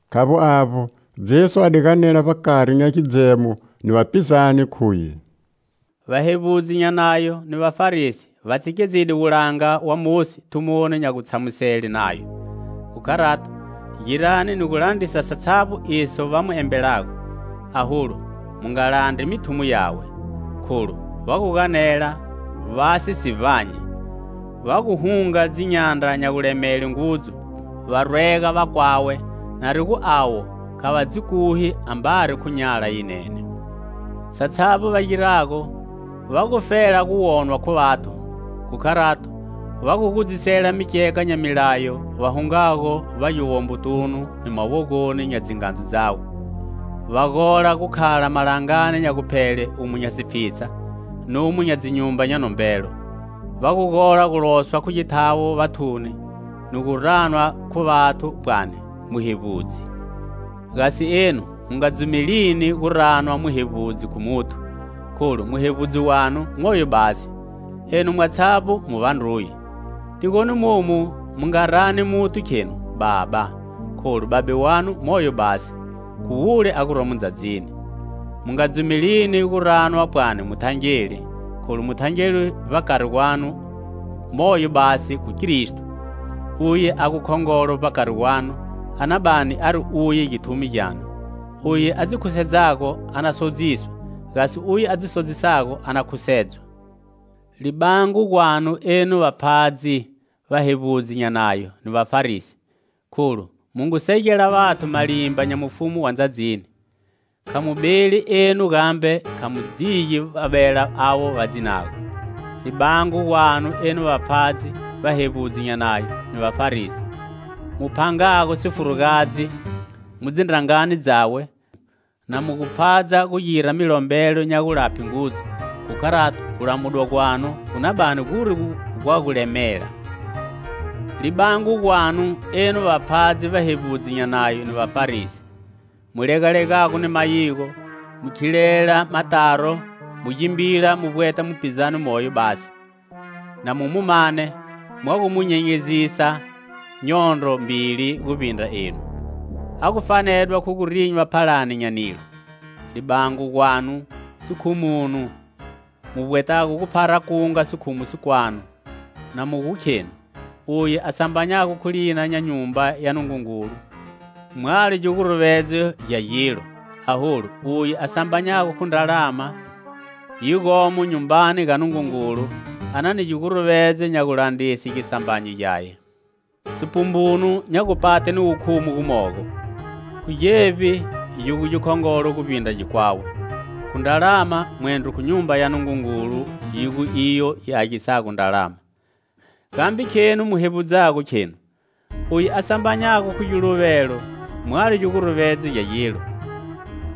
Khavbo avbo, Jesu a di ganela vbakari nya gidzemo ni vapizane, khuye: "Va hevbudzi nya nayo ni Vafarisi va tshikedzide wulanga wa Mosi thumoni nya gutshamusele Nayo. Khu kharato, girani ni gu landrisa satshavbo iso va mu embelago, aholu mu nga landri mithumo yawe, kholu va gu ganela, va si si vbanyi. Va gu hunga dzinyandra nya gulemele ngudzu, va rwega vakwawe, na ri gu avo kha va dzi kuhi, ambari khu nyala yinene. Satshavbo va girago, va gufela gu wonwa khu vathu. Khu kharato va gu gudzisela mikyeka nya milayo va hungago vbagiwombotunu ni mawogoni nya dzingandzu dzawe. Va gola gu khala malangani nya guphele umo nya sipfhitsha numo nya dzinyumba nya nombelo. Va gu gola gu loswa khu githawo vathuni ni gu ranwa khu vathu, pwani 'Muhevbudzi!' Gasi enu mu nga dzumelini gu ranwa 'Muhevbudzi' khu muthu, kholu muhevbudzi wanu moyo basi; enu mwatshavbo mu vandruye. Tigoni momu mu nga rani muthu, khenu: 'Baba', kholu Babe wanu moyo basi. Khu wule a guromo ndzadzini. Mu nga dzumelini gu ranwa pwani muthangeli, kholu muthangeli vbakari gwanu moyo basi, khu Kristo. Uye a gu khongolo vbakari gwanu a na bani ari uye githumi gyanu. Uye a dzi khusedzago a na sodziswa; gasi uye a dzi sodzisago a na khusedzwa. Libango gwanu, enu vapfhadzi, vahevbudzi nya Nayo ni Vafarisi, kholu mu ngu segela vathu malimba nya mufumu wa ndzadzini; kha mu beli enu gambe kha mu digi va bela avo va dzinago. [ Libango gwanu, enu vapfhadzi, vahevbudzi nya nayo ni Vafarisi, mu phangago sifurugadzi mu dzindrangani dzawe, na mu gu pfhadza gu gira milombelo nya gulaphe ngudzu. Khu kharato gulamudwa gwanu gu na bani guri gwa gulemela.] Libango gwanu, enu vapfhadzi, vahevbudzi nya Nayo ni Vafarisi, mu legalegago ni mayigo, mu khilela mataro mu gimbila mu vbweta mupizane moyo basi. Na mu mu mane, mwa gu mu nyenyezisa nyondro mbili guvbindra enu, a gu fanedwa khu gu rinywa phalani nya nilo. Libango gwanu, sikhumunu, mu vbwetago gu phara kunga sikhumu sikwanu, na mu gu khenu: 'Uye a sambanyago khu lina nya Nyumba ya Nungungulu mwalo giguruvedzo gya gilo, aholu uye a sambanyago khu ndralama yi gomo nyumbani ga Nungungulu a na ni giguruvedzo nya gulandrise gisambanyo gyaye.' Sipumbunu nya gupate ni wukhumu gumogo! Khu gevbi gi gu gikhongolo guvbindra gikwawe? Khu ndralama, mwendro khu Nyumba ya Nungungulu yi gu iyo yi agisago ndralama? Gambe khenu mu hevbudzago, khenu: 'Uye a sambanyago khu giluvelo mwalo giguruvedzo gya gilo;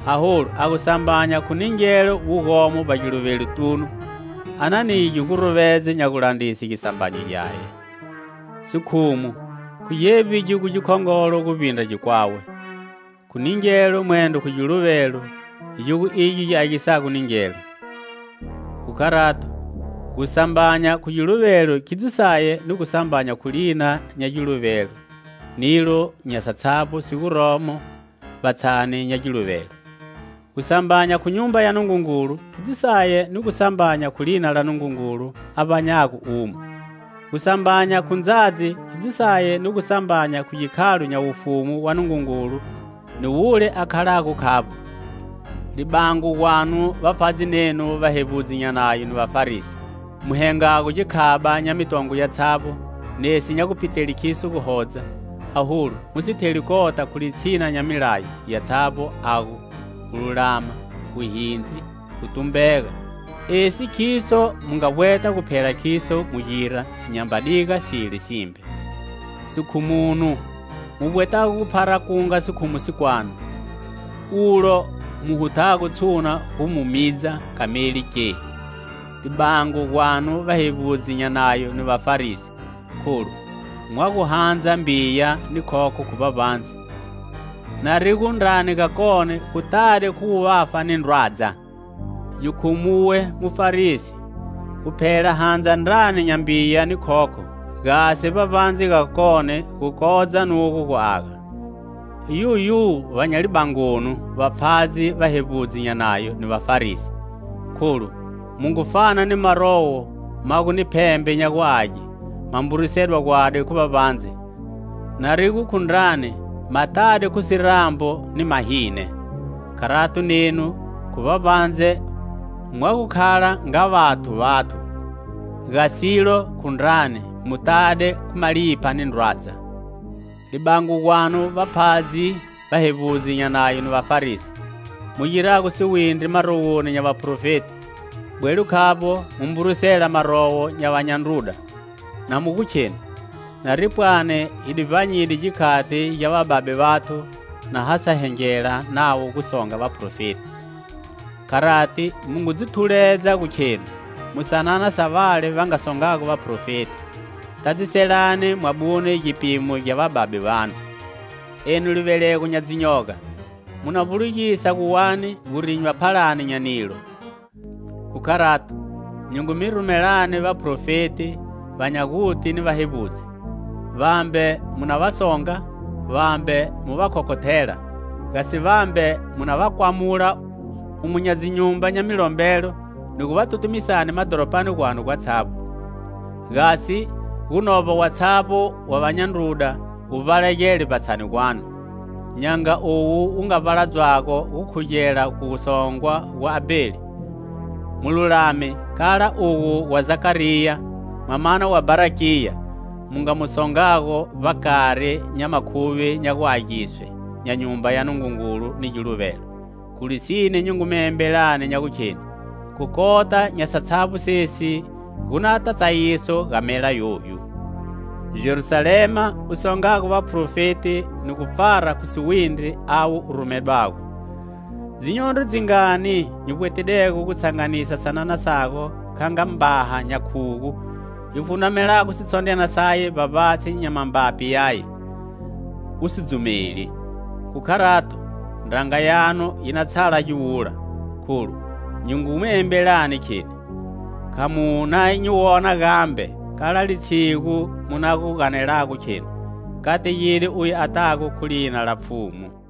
aholu a gu sambanya khu ningelo wu gomo vbagiluvelotunu a na ni giguruvedzo nya gulandrise gisambanyo gyaye.' Sikhumu! Khu gevbini gigu gikhongolo guvbindra gikwawe? Khu ningelo, mwendro khu giluvelo, gi gu igyo gi agisago ningelo? Khu kharato, gu sambanya khu giluvelo khidzo saye ni gu sambanya khu lina nya giluvelo nilo nya satshavbo si guromo vbatshani nya giluvelo; gu sambanya khu Nyumba ya Nungungulu khidzo saye ni gu sambanya khu lina la Nungungulu a vbanyago umo. Gu sambanya khu ndzadzi khidzo saye ni gu sambanya khu gikhalo nya mufumu wa Nungungulu ni wule a khalago khavbo. "Libango gwanu, vapfhadzi nenu, vahevbudzi nya Nayo ni Vafarisi, mu hengago gikhaba nya mitongwe yatshavbo, nesi nya gupitele kiso guhodza, aholu mu si theli kota khu litshina nya milayo yatshavbo, a gu: gululama, wuhindzi, ni gutumbega. Esi khiso mu nga vbweta gu phela khiso mu gira, nyamba diga sile simbe. Sikhumunu, mu vbwetago gu phara kunga sikhumu sikwanu, ulo mu hutago tshuna gu mu midza kameli, ke! "Libango gwanu, vahevbudzi nya Nayo ni Vafarisi, kholu mwa gu handza mbiya ni khokho khu vbavbandze, na ri gu ndrani gakone si tade khu wuvafa ni ndrwadza. Gikhumuwe, mufarisi, guphela handza ndrani nya mbiya ni khokho, gasi vbavbandze gakone gu kodza nugo gu aga. Yuyu va nya libangonu, vapfhadzi, vahevbudzi nya Nayo ni Vafarisi, kholu mu ngu fana ni marowo ma gu ni phembe nya guage, ma mburisedwa gwadi khu vbavbandze, nari gu khu ndrani ma tade khu sirambu ni mahine. Kharato nenu, khu vbavbandze, mwa gu khala nga vathu vathu; gasilo, khu ndrani, mu tade khu malipha ni ndrwadza. "Libango gwanu, vapfhadzi, vahevbudzi nya Nayo ni Vafarisi, mu girago siwindri marowoni nya vaprofeti, bwelo khavbo mu mburisela marowo nya vanya ndruda, na mu gu khenu: 'Nari pwani hi di vbanyide gikhati gya vababe vathu na ha sa hengela navo gu songa vaprofeti.' Kharati mu ngu dzi thuledza gu khenu mu sanana sa vale va nga songago vaprofeti. Tadziselani mwabune gipimo gya vababe vanu! Enu livelego nya dzinyoga! Mu na vbulugisa gu wani gu rinywa phalani nya nilo? Khu kharato, nyi ngu mi rumelani vaprofeti, va nya guti ni vahevbudzi. Vambe mu na va songa, vambe mu va khokhothela; gasi vambe mu na va kwamula umo nya dzinyumba nya milombelo ni gu va tutumisani madhoropani gwanu gwatshavbo, gasi gu novba watshavbo wa vanya ndruda wu vbalagele vbatshani gwanu, nya nga uwo wu nga vbaladzwago gukhugela gu songwa gwa Abheli, mululami, kala ugo gwa Zakariya, mwamana wa Bharakiya, mu nga mu songago vbakari nya makhuvi nya guagiswe nya Nyumba ya Nungungulu ni giluvelo. Khu lisine nyi ngu mi embelani nya gukheni khu kota nya satshavbo sesi gu nata tsayiso ga mela yoyu! "Jerusalema, u songago vaprofeti ni gu pfara khu siwindri avo u rumedwago! Dzinyondro dzingani nyi vbwetidego gu tshanganisa sanana sago kha nga mbaha nya khugu yi fundramelago sitshondryana saye vbavbatshi nya mambapi yaye, u si dzumeli! Khu kharato, ndranga yanu yi na tshala giwula, kholu nyi ngu mi embelani, kheni: Kha mu na nyi wona gambe kala litshigu mu na gu ganelago khenu: 'Kategide uye a tago khu lina la Pfhumu.' "